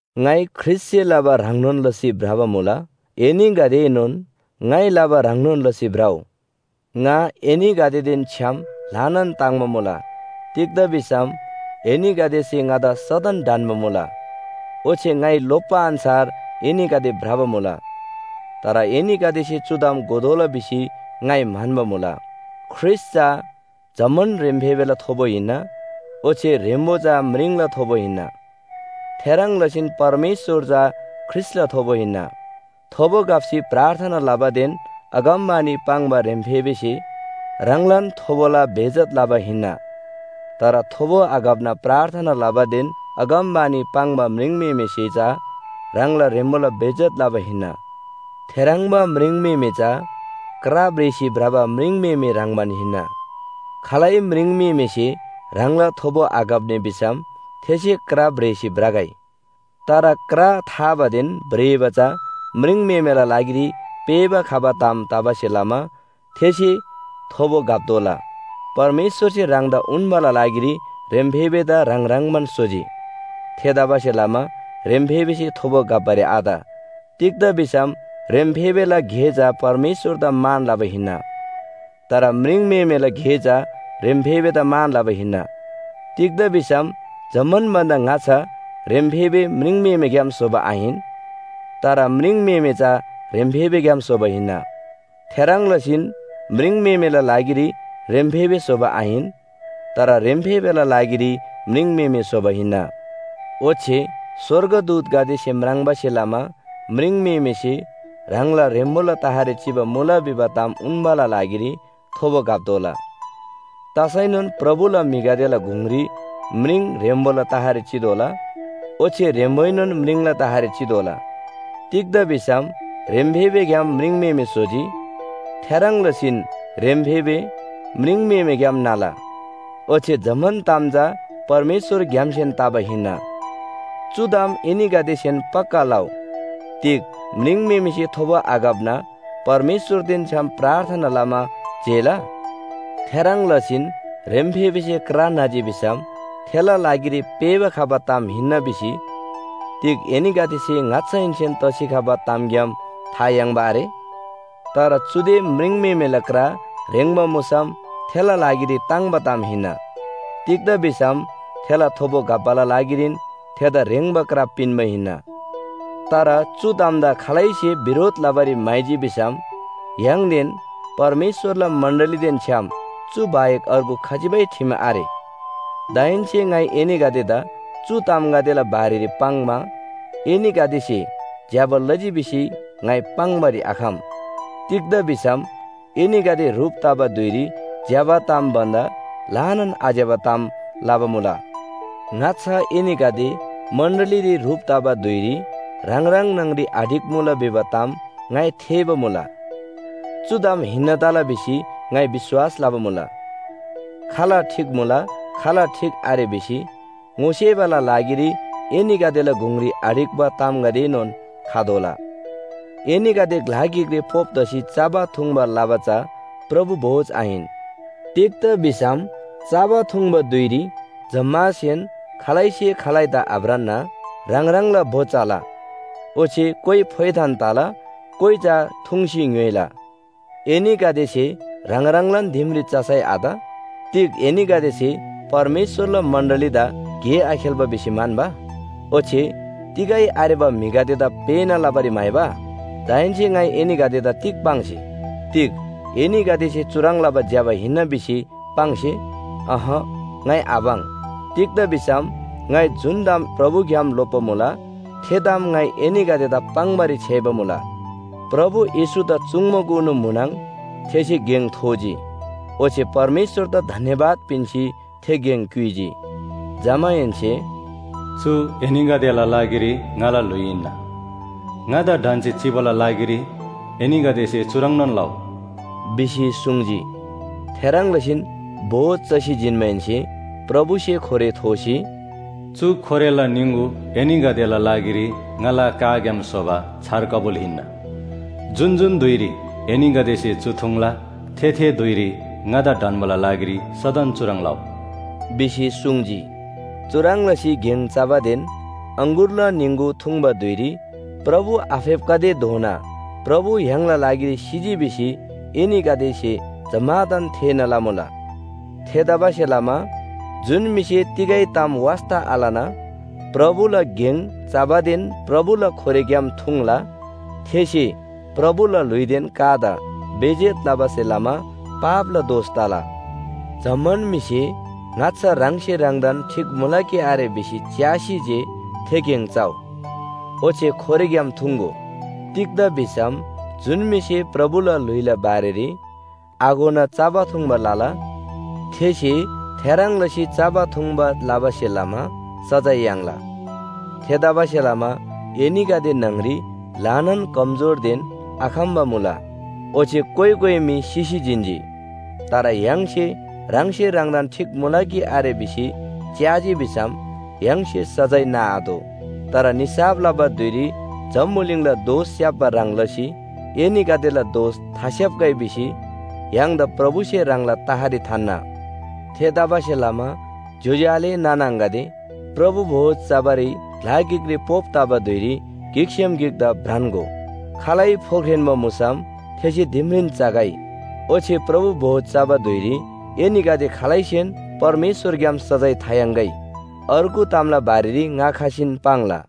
ङाइ ख्रीष्‍टसे लबा ह्रङ्नोन लसी भ्रबा मुला, एनीगदेएनोन ङाइ लबा ह्रङ्नोन लसी भ्रउ। ङा एनीगदेदेन छ्‌याम ल्‍हानान ताङ्‍बा मुला। तिग्‍दा भिसम एनीगदेसे ङादा सदन ढन्‍बा मुला, ओच्‍छे ङाइ लोप्‍बा अन्‍छार एनीगदे भ्रबा मुला। तर एनीगदेसे चु ताम घोतोःला भिसी ङाइ म्‍हन्‍बा मुला। ख्रीष्‍ट चा जम्‍मान ह्रेम्‍फेबेला थोबो हिन्‍ना ओच्‍छे ह्रेम्‍बो चा म्रिङला थोबो हिन्‍ना। थेह्रङ् लसीन परमेश्‍वर चा ख्रीष्‍टला थोबो हिन्‍ना। थोबो घप्‍सी प्रार्थना लबादेन अगमवाणी पाङ्बा ह्रेम्‍फेबेसे ह्राङलान थोबोला बेइज्‍जत लबा हिन्‍ना। तर थोबो आघप्‍ना प्रार्थना लबादेन अगमवाणी पाङ्बा म्रिङम्‍हेमेसे चा ह्राङला ह्रेम्‍बोला बेइज्‍जत लबा हिन्‍ना। थेह्रङ्बा म्रिङम्‍हेमे चा क्रा भ्रेसी भ्रबा म्रिङम्‍हेमे ह्रङ्‌बान हिन्‍ना। खालै म्रिङम्‍हेमेसे ह्राङला थोबो आघप्‍नी भिसम थेसे क्रा भ्रेसी भ्रगै। तर क्रा थाबादेन भ्रेबा चा म्रिङम्‍हेमेला लागिरी पेःबा खबा ताम तबासे लमा थेसे थोबो घप्‍तोःला। परमेश्‍वरसे ह्राङदा उन्‍बाला लागिरी ह्रेम्‍फेबेदा ह्राङ ह्रङ्‌बान स्‍होजी। थेतबासेलमा ह्रेम्‍फेबेसे थोबो घप्‍बारी आत। तिग्‍दा भिसम ह्रेम्‍फेबेला गे चा परमेश्‍वरदा मान लबा हिन्‍ना। तर म्रिङम्‍हेमेला गे चा ह्रेम्‍फेबेदा मान लबा हिन्‍ना। तिग्‍दा भिसम जम्‍मान भन्‍दा ङाच्‍छा ह्रेम्‍फेबे म्रिङम्‍हेमेग्‍याम स्‍होबा आहिन, तर म्रिङम्‍हेमे चा ह्रेम्‍फेबेग्‍याम स्‍होबा हिन्‍ना। थेह्रङ् लसीन म्रिङम्‍हेमेला लागिरी ह्रेम्‍फेबे स्‍होबा आहिन, तर ह्रेम्‍फेबेला लागिरी म्रिङम्‍हेमे स्‍होबा हिन्‍ना। ओच्‍छे स्‍वर्गदूतगदेसे म्राङ्बासे लमा म्रिङम्‍हेमेसे ह्राङला ह्रेम्‍बोला तहरी चिबा मुला भिबा ताम उन्‍बाला लागिरी थोबो घप्‍तोःला। तसैनोन प्रभुला म्‍हिगदेला गुङरी म्रिङ ह्रेम्‍बोला तहरी चितोःला ओच्‍छे ह्रेम्‍बोएनोन म्रिङला तहरी चितोःला। तिग्‍दा भिसम ह्रेम्‍फेबेग्‍याम म्रिङम्‍हेमे स्‍होजी। थेह्रङ् लसीन ह्रेम्‍फेबे म्रिङम्‍हेमेग्‍याम न्‍हला। ओच्‍छे जम्‍मान ताम चा परमेश्‍वरग्‍यामसेन तबा हिन्‍ना। चु ताम एनीगदेसेन पक्‍का लउ, तिग म्रिङम्‍हेमेसे थोबो आघप्‍ना परमेश्‍वरदेन छ्‌याम प्रार्थना लमा जेला? थेह्रङ् लसीन ह्रेम्‍फेबेसे क्रा न्‍हजी भिसम थेला लागिरी पेःबा खबा ताम हिन्‍ना भिसी तिग एनीगदेसे ङाच्‍छाहेन्‍सेन तसी खबा तामग्‍याम था याङ्बा आरे? तर चुदे म्रिङम्‍हेमेला क्रा ह्रेङ्बा मुसम थेला लागिरी ताङ्‍बा ताम हिन्‍ना। तिग्‍दा भिसम थेला थोबो घप्‍बाला लागिरीन थेदा ह्रेङ्बा क्रा पिन्‍बा हिन्‍ना। तर चु तामदा खालैसे बिरोध लबारी म्‍हाइजी भिसम य्‍हाङदेन परमेश्‍वरला मण्‍डलीदेन छ्‌याम चु बाहेक अर्गु खजिबै ठिम आरे। दाहेन्‍से ङाइ एनीगदेदा चु तामगदेला बारेरी पाङ्‌मा एनीगदेसे ज्‍यबा लजी भिसी ङाइ पाङ्‌बारी आखम। तिग्‍दा भिसम एनीगदे ह्रुप तबा धुइरी ज्‍यबा ताम भन्‍दा ल्‍हानान आज्‍यबा ताम लबा मुला। ङाच्‍छा एनीगदे मण्‍डलीरी ह्रुप तबा धुइरी ह्राङ ह्राङ न्‍हङरी आढिक्‍मुला भिबा ताम ङाइ थेःबा मुला। चु ताम हिन्‍ना तला भिसी ङाइ विश्‍वास लबा मुला। खाल ठीक मुला, खाल ठीक आरे भिसी ङोसेबाला लागिरी एनीगदेला गुङरी आढिक्‍बा तामगदेएनोन खतोःला। एनीगदे ग्‍ला गिकरी पोप तसी चबा थुङ्बा लबा चा प्रभु भोज आहिन। तिग्‍दा भिसम चबा थुङ्बा धुइरी जम्‍मासेन खालैसे खालैदा आभ्रान्‍ना ह्राङ ह्राङला भो चला। ओच्‍छे कोइ फोइथान तला, कोइ चा थुङ्सी ङ्‌य्‍होइला। एनीगदेसे ह्राङ ह्राङलान दिमरी चसै आत? तिग एनीगदेसे परमेश्‍वरला मण्‍डलीदा गे आखेल्‍बा भिसी म्‍हन्‍बा? ओच्‍छे तिगै आरेबा म्‍हिगदेदा पेःना लबारी म्‍हाइबा? दाहेन्‍से ङाइ एनीगदेदा तिग पाङ्से? तिग एनीगदेसे चुह्रङ् लबा ज्‍यबा हिन्‍ना भिसी पाङ्से? अहँ, ङाइ आपाङ्। तिग्‍दा भिसम ङाइ जुन ताम प्रभुग्‍याम लोप्‍बा मुला थे ताम ङाइ एनीगदेदा पाङ्‌बारी छ्‌याइबा मुला। प्रभु येशूदा चुङ्‌बाकुनु म्‍हुनङ थेसे गेङ थोजी। ओच्‍छे परमेश्‍वरदा धन्‍यवाद पिन्‍सी थे गेङ क्‍युइजी। जमाहेन्‍से “चु एनीगदेला लागिरी ङाला ल्‍हुइ हिन्‍ना। ङादा ढन्‍सी चिबाला लागिरी एनीगदेसे चुह्रङ्‌नोन लउ” भिसी सुङ्जी। थेह्रङ् लसीन भोज चसी जिन्‍माहेन्‍से प्रभुसे खोरे थोसी, “चु खोरेला निङगु एनीगदेला लागिरी ङाला काग्‍याम स्‍होबा छार कबुल हिन्‍ना। जुन जुन धुइरी एनीगदेसे चु थुङ्ला थे, थे धुइरी ङादा ढन्‍बाला लागिरी सदन चुह्रङ् लउ” भिसी सुङ्जी। चुह्रङ् लसी गेङ चबादेन अङगुरला निङगु थुङ्बा धुइरी प्रभु आफेप्‍खतेधोना प्रभु य्‍हाङला लागिरी सिजी भिसी एनीगदेसे जम्‍मादान थेःना लमुला। थेतबासेलमा जुन म्‍हिसे तिगै ताम वास्‍ता आलना प्रभुला गेङ चबादेन प्रभुला खोरेग्‍याम थुङ्ला थेसे प्रभुला ल्‍हुइदेन कादा बेइज्‍जत लबासे लमा पापला दोष तला। जम्‍मान म्‍हिसे ङाच्‍छा ह्राङसे ह्राङदान ठीक मुला कि आरे भिसी च्‍यासी जे थे गेङ चउ, ओच्‍छे खोरेग्‍याम थुङ्‍गो। तिग्‍दा भिसम जुन म्‍हिसे प्रभुला ल्‍हुइला बारेरी आघोना चबा थुङ्बा लला, थेसे थेह्रङ् लसी चबा थुङ्बा लबासे लमा सजाय याङ्ला। थेतबासेलमा एनीगदे न्‍हङरी ल्‍हानान कमजोरदेन आखम्‍बा मुला, ओच्‍छे कोइ कोइ मी सिसी जिन्‍जी। तर य्‍हाङसे ह्राङसे ह्राङदान ठीक मुला कि आरे भिसी च्‍याजी भिसम य्‍हाङसे सजाय नाआतोः। तर निसाफ लबा धुइरी जम्‍बुलिङला दोष स्‍याप्‍बा ह्रङ् लसी एनीगदेला दोष थास्‍याप्‍गै भिसी य्‍हाङदा प्रभुसे ह्राङला तहरी थान्‍ना। थेतबासेलमा ज्‍योज्‍यो आले नाना आङागदे, प्रभु भोज चबारी ग्‍ला गिकरी पोप तबा धुइरी गिकसेम गिकदा भ्रान्‍गो। खालै फोख्रेन्‍बा मुसम थेसे दिमरीन चगै, ओच्‍छे प्रभु भोज चबा धुइरी एनीगदे खालैसेन परमेश्‍वरग्‍याम सजाय थायाङ्‌गै। अर्गु तामला बारेरी ङा खसीन पाङ्ला।